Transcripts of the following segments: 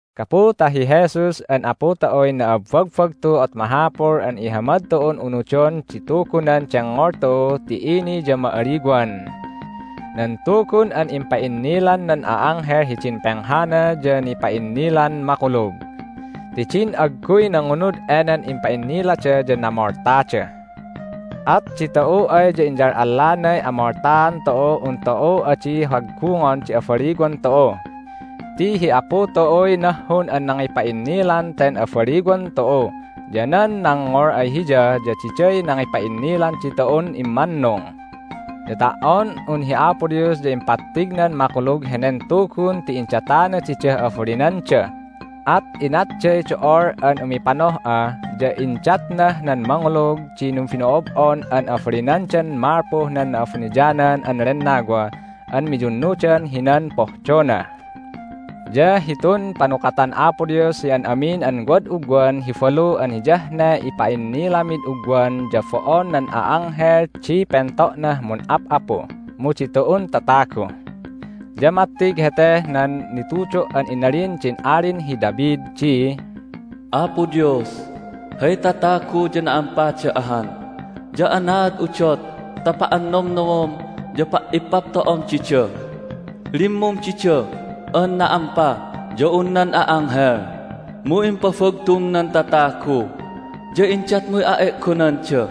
Gapu ta hi Jesus an Apu tu'uy na'abbagbagtu at mahapul an ihamad tu'un unudon di Tugunan dengngol tu'u ti ini ya ma'aliwan! Nan Tugun an impa'innilan nan a'anghel hidin penghana ya nipa'innilan makulug. Ti din agguy nangunud enen impa'innilada ya namoltada. At ditu'u ay ya inyal'allanay amoltaan tu'uh un tu'u adi haggungon di abaliwan tu'u! Ti hi Apu tu'uy nahhun an nangipa'innilan ten abaliwan tu'u, ya nan nangngol ay Hiya ya diday nangipa'innilan ditu'un immannung. Ya ta"on un hi Apo Dios ya impattignan makulug henen Tugun ti indatana didah abalinanda, at inatday do'ol an umipanoh'a, ya indatnah nan mangulug di numbino'ob'on an abalinandan malpuh nan Na'abuniyanan an Lennawa an miyunnudan hinan pohdona. Ya hitun panukatan Apo Dios hi an amin an wad ugwan hi balu an hiyah ne ipa'innilamid ugwan ya bo'on nan a'anghel di pento'nah mun'ap'apu, mu ditu'un tatagu. Ya mattig heteh nan nitudo' an inalin din Alin hi David di, "Apo Dios, hay tatagu ya na'ampada ahan, ya anaad udot ta pa'annomnomom ya pa'ippapto'om dida? Limmum dida an na"ampa ya un nan a'anghel, mu impabagtum nan tatagu, ya indatmuy a'e'gonanda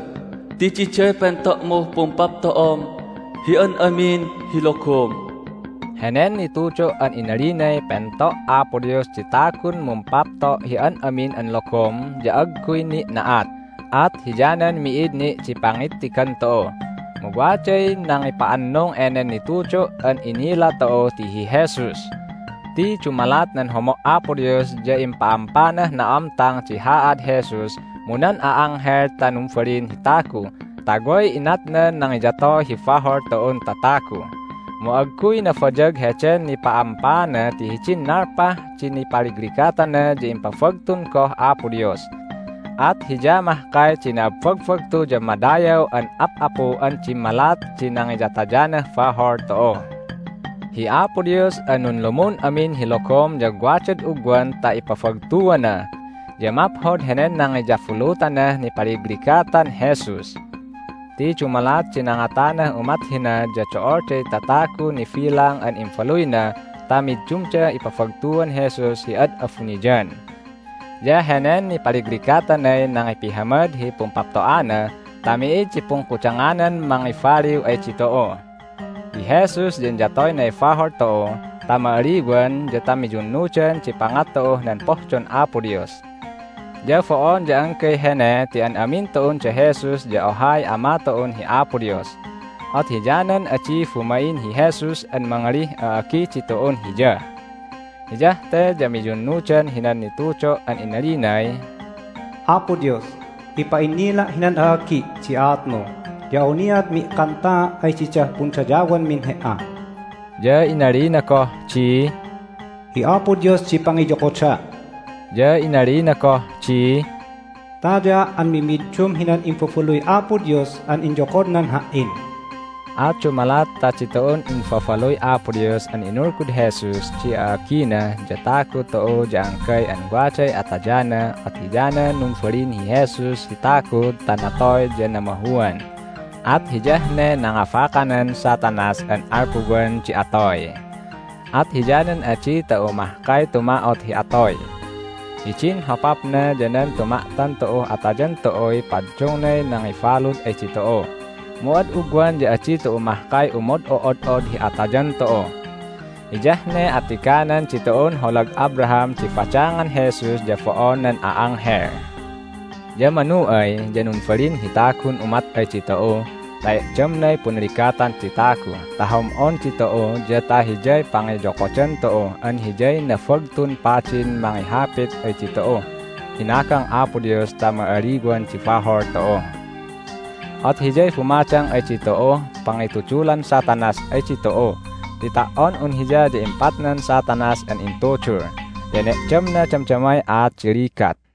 ti diday pento'muh pumpapto'om hi an amin hi logom." Henen nitudo' an inalinay pento' Apo Dios di tagun mumpapto' hi an amin an logom ya agguy ni' na'at, at hiyanan mi'id ni' di pangittigan tu'u. Mu waday nangipa'annung enen nitudo' an inila tu'u ti hi Jesus! Ti dumalat nan homo' Apo Dios ya impa'ampanah na'amtang di haad Jesus mu nan a'anghel ta numbalin hi tagu ta way inatnan nangiyatoy hi bahol tu'un tatagu. Mu agguy nabayag heden nipa'ampaana ti hidin nalpah di nipaligligatana ya impabagtun goh Apo Dios. At Hiya mahkay di na'abbagbagtu ya madayaw an Ap'apu an dimmalat di nangiyatayanah bahol tu'u. Hi Apo Dios an nunlumun amin hi logom ya wadad ugwan ta ipabagtuana, ya maphod henen nangiyabulutanah nipaligligatan Jesus. Ti dumalat di nangatanah umat hina ya do'olday tatagun nibilang an imbaluyna ta middumdah ipabagtuan Jesus hi ad abuniyan. Ya henen nipaligligatanay nangipihamad hi pumpapto'ana ta mi'id di pungkudanganan mangibaliw ay ditu'u. Hi Jesus ya inyatoynay bahol tu'u ta ma'aliwan ya ta miyunnudan di pangat tu'uh nan pohdon Apo Dios. Ya bo'on ya anggay hene ti an amin tu'un da Jesus ya ohay Ama tu'u an hi Apo Dios. At hiyanan adi bumain hi Jesus an mangalih a'agi ditu'un Hiya. Hiyah te ya miyunnudan hinan nitudo' an inalinay, "Apo Dios, ipa'innila' hinan a'agi' di aatmu, ya awniat mi'kantaa' ay didah pundayawmin He"a." Ya inalina goh di, "Hi Apo Dios di pangiyokoda'." Ya inalina goh di, "Tayaa' an mimiddum hinan imbabaluy Apo Dios an inyokodnan Ha"in." At dumalat ta ditu'un imbabaluy Apo Dios an inulgud Jesus di a'agina ya tagu tu'u ya anggay an waday atayana at hiyanan numbalin hi Jesus hi tagu ta natoy ya namahuan, at hiyah ne nangabakanan Satanas an alpuwan di atoy. At hiyanan adi tu'u mahkay tuma'ot hi atoy. Hidin hopapna ya nan tuma'tan tu'uh atayan tu'uy paddungnay nangibalud ay ditu'u, mu ad ugwan ya adi tu'u mahkay umod'o'od'od hi atayan tu'u. Hiyah ne attiganan ditu'un holag Abraham di badangan Jesus ya bo'on nan a'anghel. Ya manu ay ya numbalin hi tagun umat ay ditu'u ta e'damnay punligatan di tagu ta hom'on ditu'u ya ta Hiyay pangiyokodan tu'u an Hiyay Nabagtun Padin mangihapit ay ditu'uh hinagang Apo Dios ta ma'aliwan di bahol tu'u. At Hiyay bumadang ay ditu'uh pangitudulan Satanas ay ditu'u ti ta"on un Hiya ya impatnan Satanas an intudul, ya ene'damna damdamay aat di ligat.